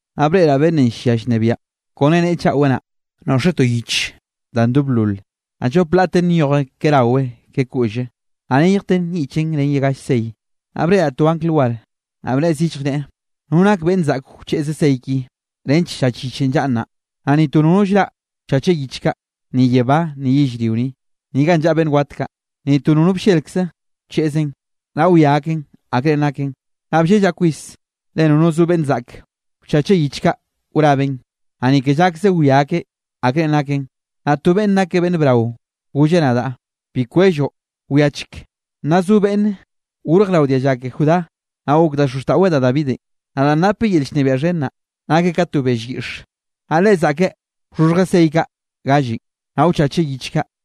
Naꞌ breꞌraꞌ beꞌnnenꞌ llia llnebiaꞌn, kone neꞌe chaꞌwe naꞌ, noꞌxeꞌ to yich da ndoblol, naꞌ llop laꞌten nyoje ke rawe ke koꞌlle, naꞌ neyjten nyiꞌchen ren galle sey. Naꞌ breꞌraꞌ to angl war, naꞌ bnneꞌe zillje, neꞌe: —¿No nake beꞌnn zaꞌk wcheꞌze sey ki, nench llach yichenꞌ llaꞌn naꞌ? Naꞌ ni to nono llraꞌ wchache yich kaꞌ, ni yebá, ni yellrio ni, ni ganꞌ llaꞌa beꞌnn wat kaꞌ, ni to nono bllelkze wcheꞌzeꞌn, naꞌ wia akeꞌn akre naken. Naꞌ bllellaꞌ kwis, le nono zo beꞌnn zaꞌk wchacheꞌ yich kaꞌ wrabeꞌn, naꞌ ni ke llakze wia akeꞌn akre naken. Naꞌ to beꞌnn nake beꞌnn brao golleꞌ nadaꞌ: —Bi kwelloꞌ. Wiachek, naꞌ zo beꞌnnenꞌ gorj rao dialla ke Judá, naꞌ gok da xozxtaꞌweꞌ da Davidenꞌ, naꞌ danꞌ napeꞌ yel llnebiaꞌ xhen naꞌ, nakeꞌ ka to bell yiꞌx. Naꞌ Leꞌe zaꞌkeꞌ wxhoxhjeꞌ sey kaꞌ gallenꞌ, naꞌ wchacheꞌ yich kaꞌ.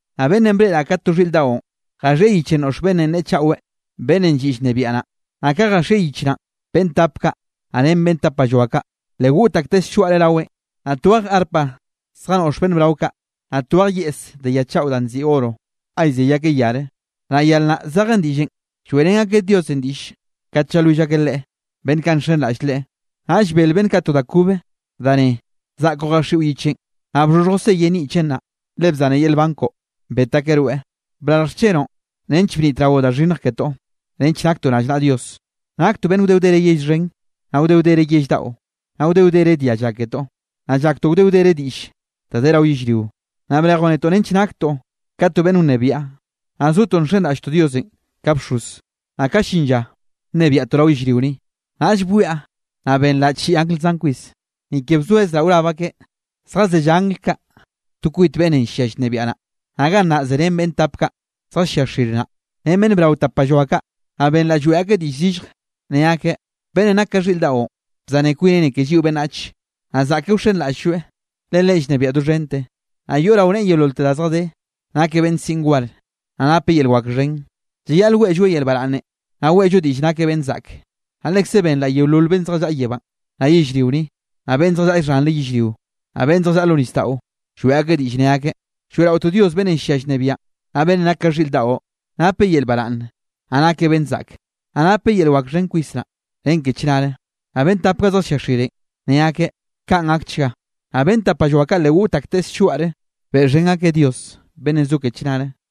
Naꞌ beꞌnnenꞌ breꞌraꞌ ka to xhiꞌr daꞌon, jaxieꞌ yichenꞌ noꞌx beꞌnnenꞌ neꞌe chaꞌwe, beꞌnnenꞌ lliꞌ llnebiaꞌ naꞌ. Naꞌ ka jaxieꞌ yich naꞌn, beꞌnn tap kaꞌ, naꞌ ren beꞌnn tapalloa kaꞌ, le goꞌt akteꞌ slloaꞌre raweꞌn. Naꞌ twej arpa zjanoꞌx beꞌnn brao kaꞌ, naꞌ twej yeꞌs de ya chaꞌo danꞌ nziꞌi oro ga llzey akeꞌ yare, naꞌ yar naꞌ zeje diꞌllenꞌ, lloeꞌrén akeꞌ Diosenꞌ diꞌll kat llalwill akeꞌ Leꞌe, beꞌnn kaꞌ nxenraꞌll Leꞌe. Naꞌll bel beꞌnn kaꞌ to da kobe danꞌ neꞌe: Zaꞌkoꞌ jaxiꞌo yichenꞌ, naꞌ bxhoxhjoꞌ seyenꞌ nyiꞌchen naꞌ, le bzane yel nban koꞌo, bet akeꞌ rweꞌ. Brarj xchenoꞌ nench bnitraoꞌ da xhinnj ketoꞌ, nench naktoꞌ rallnaꞌa Dios, naktoꞌ beꞌnn wde wdere yell xhen, naꞌ wde wdere yell daꞌo, naꞌ wde wdere dialla ketoꞌ, naꞌ llaktoꞌ wde wdere diꞌll da de rao yellrio. Naꞌ brejoꞌ netoꞌ nench naktoꞌ ka to beꞌnn wnebiaꞌ, naꞌ zotoꞌ nxenraꞌlltoꞌ Diosenꞌ ka bxoz, naꞌ ka llin lla, nnebiaꞌtoꞌ rao yellrio ni. Naꞌll bwiaꞌ naꞌ benraꞌ chiꞌi angl zan kwis, ni ke bzoezraꞌ wrab akeꞌ. Zjazellá angl kaꞌ to kwit beꞌnnenꞌ llia llnebiaꞌ naꞌ, naꞌ gannaꞌ zerén beꞌnn tap kaꞌ zjallia xire naꞌ, ren beꞌnn brao tapalloa kaꞌ. Naꞌ benraꞌ lloeꞌ akeꞌ diꞌll zillje, ne akeꞌ: Beꞌnnenꞌ nak ka xhiꞌr daꞌon, bzane kwineꞌ ni ke lliꞌo beꞌnnach, naꞌ zaꞌke wxenraꞌll-lloeꞌ, le Leꞌen llnebieꞌ doxhente, naꞌ yoꞌ rao neꞌe yeololte da zjadé. Nakeꞌ beꞌnn siꞌn war, naꞌ napeꞌ yel wak xhen. Llayaꞌle weꞌlloeꞌ yel baraꞌnne, naꞌ weꞌllo diꞌll nakeꞌ beꞌnn zaꞌke. Naꞌ lekze benraꞌ yeolol beꞌnn zjallaꞌa yebánꞌ, naꞌ yellrio ni, naꞌ beꞌnn zjallaꞌa xhanre yellrio, naꞌ beꞌnn zjallaꞌa lo nisdaꞌo, lloeꞌ akeꞌ diꞌll ne akeꞌ: Lloeꞌraotoꞌ Dios beꞌnnenꞌ llia llnebiaꞌn, naꞌ beꞌnnenꞌ nake ka xhiꞌr daꞌo, napeꞌ yel baraꞌnn, naꞌ nakeꞌ beꞌnn zaꞌke. Naꞌ napeꞌ yel wak xhen kwis nnaꞌ, ren ke chnare. Naꞌ beꞌnn tap kaꞌ zjallia xirenꞌ, ne akeꞌ: —Kaꞌn gakchga. Naꞌ beꞌnn tapalloa kaꞌ le goꞌt akteꞌ slloaꞌre, beꞌxhen akeꞌ Dios beꞌnnenꞌ zo ke chnare.